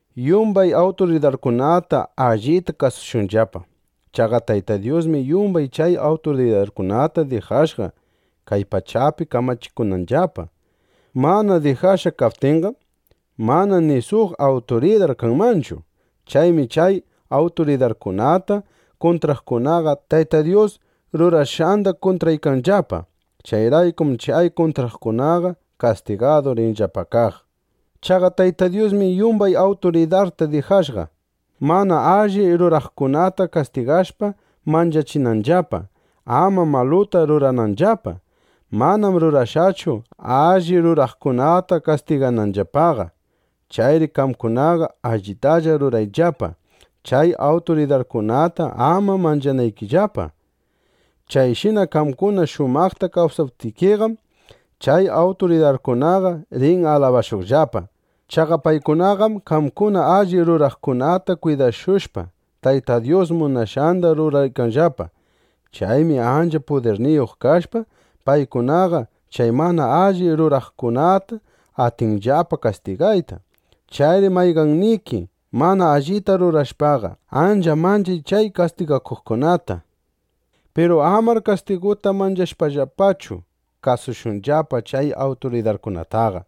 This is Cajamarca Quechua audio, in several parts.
Yumbay awturidarkunata allita kasushunllapa. Chaqa Tayta Dyusmi yumbay chay awturidarkunata dijashqa, kay pachapi kamachikunanllapa. Mana dijashqa kaptinqam, mana ni suq awturidar kanmanchu. Chaymi chay awturidarkunata kuntraqkunaqa Tayta Dyus rurashqanda kuntraykanllapa. Chayraykum chay kuntraqkunaqa kastigadu rinllapa kaq. Chaqa Tayta Dyusmi yumbay awturidarta dijashqa, mana alli ruraqkunata kastigashpa, manchachinanllapa, ama maluta rurananllapa. Manam rurashqachu, alli ruraqkunata kastigananllapaqa. Chayri qamkunaqa allitalla rurayllapa, chay awturidarkunata ama manchanaykillapa. Chayshina qamkuna shumaqta kawsaptikiqam, chay awturidarkunaqa rin alabashuqllapa. Chaqa paykunaqam qamkuna alli ruraqkunata kwidashushpa, Tayta Dyus munashqanda ruraykanllapa. Chaymi ancha pudirniyuq kashpa, paykunaqa chay mana alli ruraqkunata atinllapa kastigayta. Chayri mayqanniki mana allita rurashpaqa, ancha manchay chay kastigakuqkunata. Piru amar kastiguta manchashpallachu kasushunllapa chay awturidarkunataqa.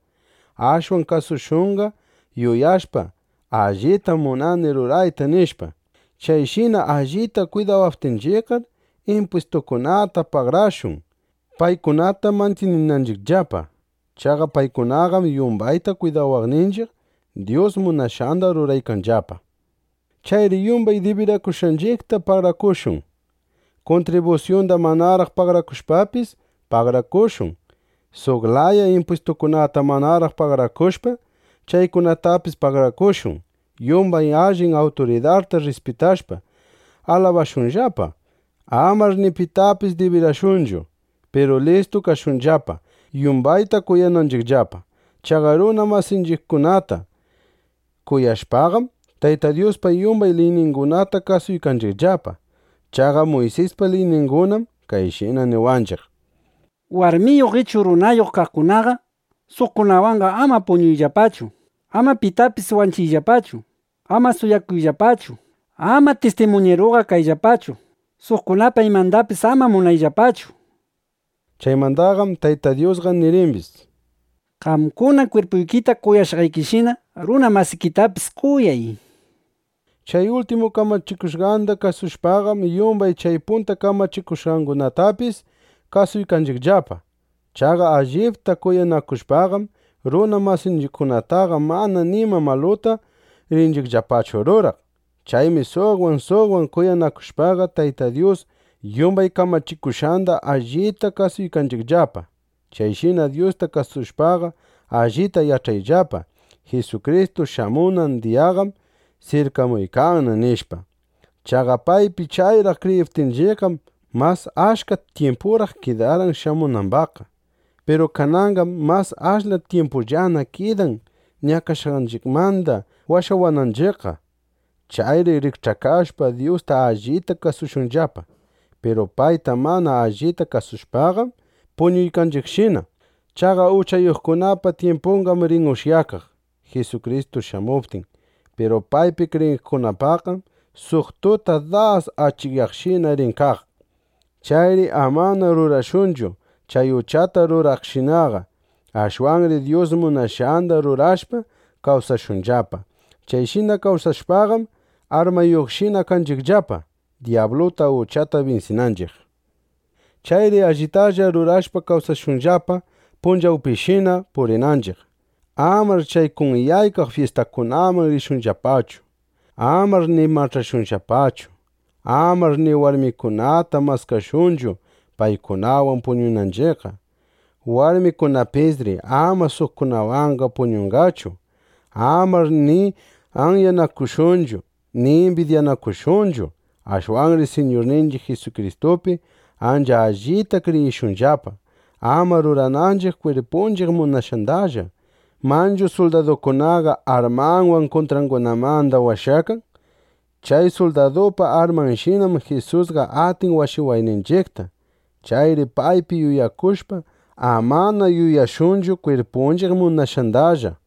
Ashwan kasushunqa, yuyashpa: Allitam munani rurayta, nishpa. Chayshina allita kwidawaptinchiqqar, impwistukunata pagarashun, paykunata mantyininanchiqllapa. Chaqa paykunaqam yumbayta kwidawaqninchiq, Dyus munashqanda ruraykanllapa. Chayri yumbay dibirakushqanchiqta pagarakushun. Kuntribusyunda manaraq pagarakushpapis, pagarakushun. Suq laya impwistukunata manaraq pagarakushpa, chaykunatapis pagarakushun. Yumbay allin awturidarta rrispitashpa, alabashunllapa. Amar ni pitapis dibirashunchu. Piru listu kashunllapa, yumbayta kuyananchiqllapa. Chaqa runa masinchiqkunata kuyashpaqam, Tayta Dyuspa yumbay liyningunata kasuykanchiqllapa. Chaqa Muysispa liyningunam kayshina niwanchiq: “Warmiyuq ichu runayuq kaqkunaqa suqkunawanqa ama puñuyllapachu; ama pitapis wanchiyllapachu; ama suwakuyllapachu; ama tistimuñiruqa kayllapachu; suqkunapa imandapis ama munakuyllapachu”, nishpa. Chaymandaqam Tayta Dyusqa nirimbis: “Qamkuna kwirpuykita kuyashqaykishina, runa masikitapis kuyay”, nishpa. Chay ultimu kamachikushqanda kasushpaqam, yumbay chay punta kamachikushqangunatapis, kasuykanchiqllapa. Chaqa allipta kuyanakushpaqam, runa masinchiqkunataqa manana nima maluta rinchiqllapachu ruraq. Chaymi suqwan suqwan kuyanakushpaqa, Tayta Dyus yumbay kamachikushqanda allita kasuykanchiqllapa. Chayshina Dyusta kasushpaqa, allita yach'ayllapa: Jisukristu shamunan diyaqam sirkamuykanna, nishpa. Chaqa paypi chayraq kriyiptinchiqqam, mas achka tyimpuraq kidarqan shamunambaqqa. Piru kananqam mas ashla tyimpullana kidan ñakashqanchiqmanda washawananchiqqa. Chayri rikch'akashpa, Dyusta allita kasushunllapa. (Piru payta mana allita kasushpaqam puñuykanchiqshina.) Chaqa uchayuqkunapa tyimpunqam rin ushyakaq Jisukristu shamuptin. Piru paypi kriyiqkunapaqqam suq tuta das achikyaqshina rin kaq. Chayri amana rurashunchu chay uchata ruraqshinaqa. Ashwanri Dyus munashqanda rurashpa kawsashunllapa. Chayshina kawsashpaqam, armayuqshina kanchiqllapa dyabluta, uchata binsinanchiq. Chayri allitalla rurashpa kawsashunllapa, punchawpishina purinanchiq. Amar chay kunyaykaq fyistakunaman rishunllapachu. Amar ni mach'ashunllapachu. Amar ni warmikunata maskashunchu, paykunawan puñunanchiqqa. Warmikunapisri ama suqkunawanqa puñunqachu. Amar ni anyanakushunchu ni imbidyanakushunchu. Ashwanri Siñurninchiq Jisukristupi ancha allita kriyishunllapa, ama rurananchiq kwirpunchiq munashqandalla. Manchu suldadukunaqa armanwan kuntrangunamanda washakan. Chay suldadupa armanshinam Jisusqa atin washawayninchiqta. Chayri paypi yuyakushpa, amana yuyashunchu kwirpunchiq munashqandallaqa.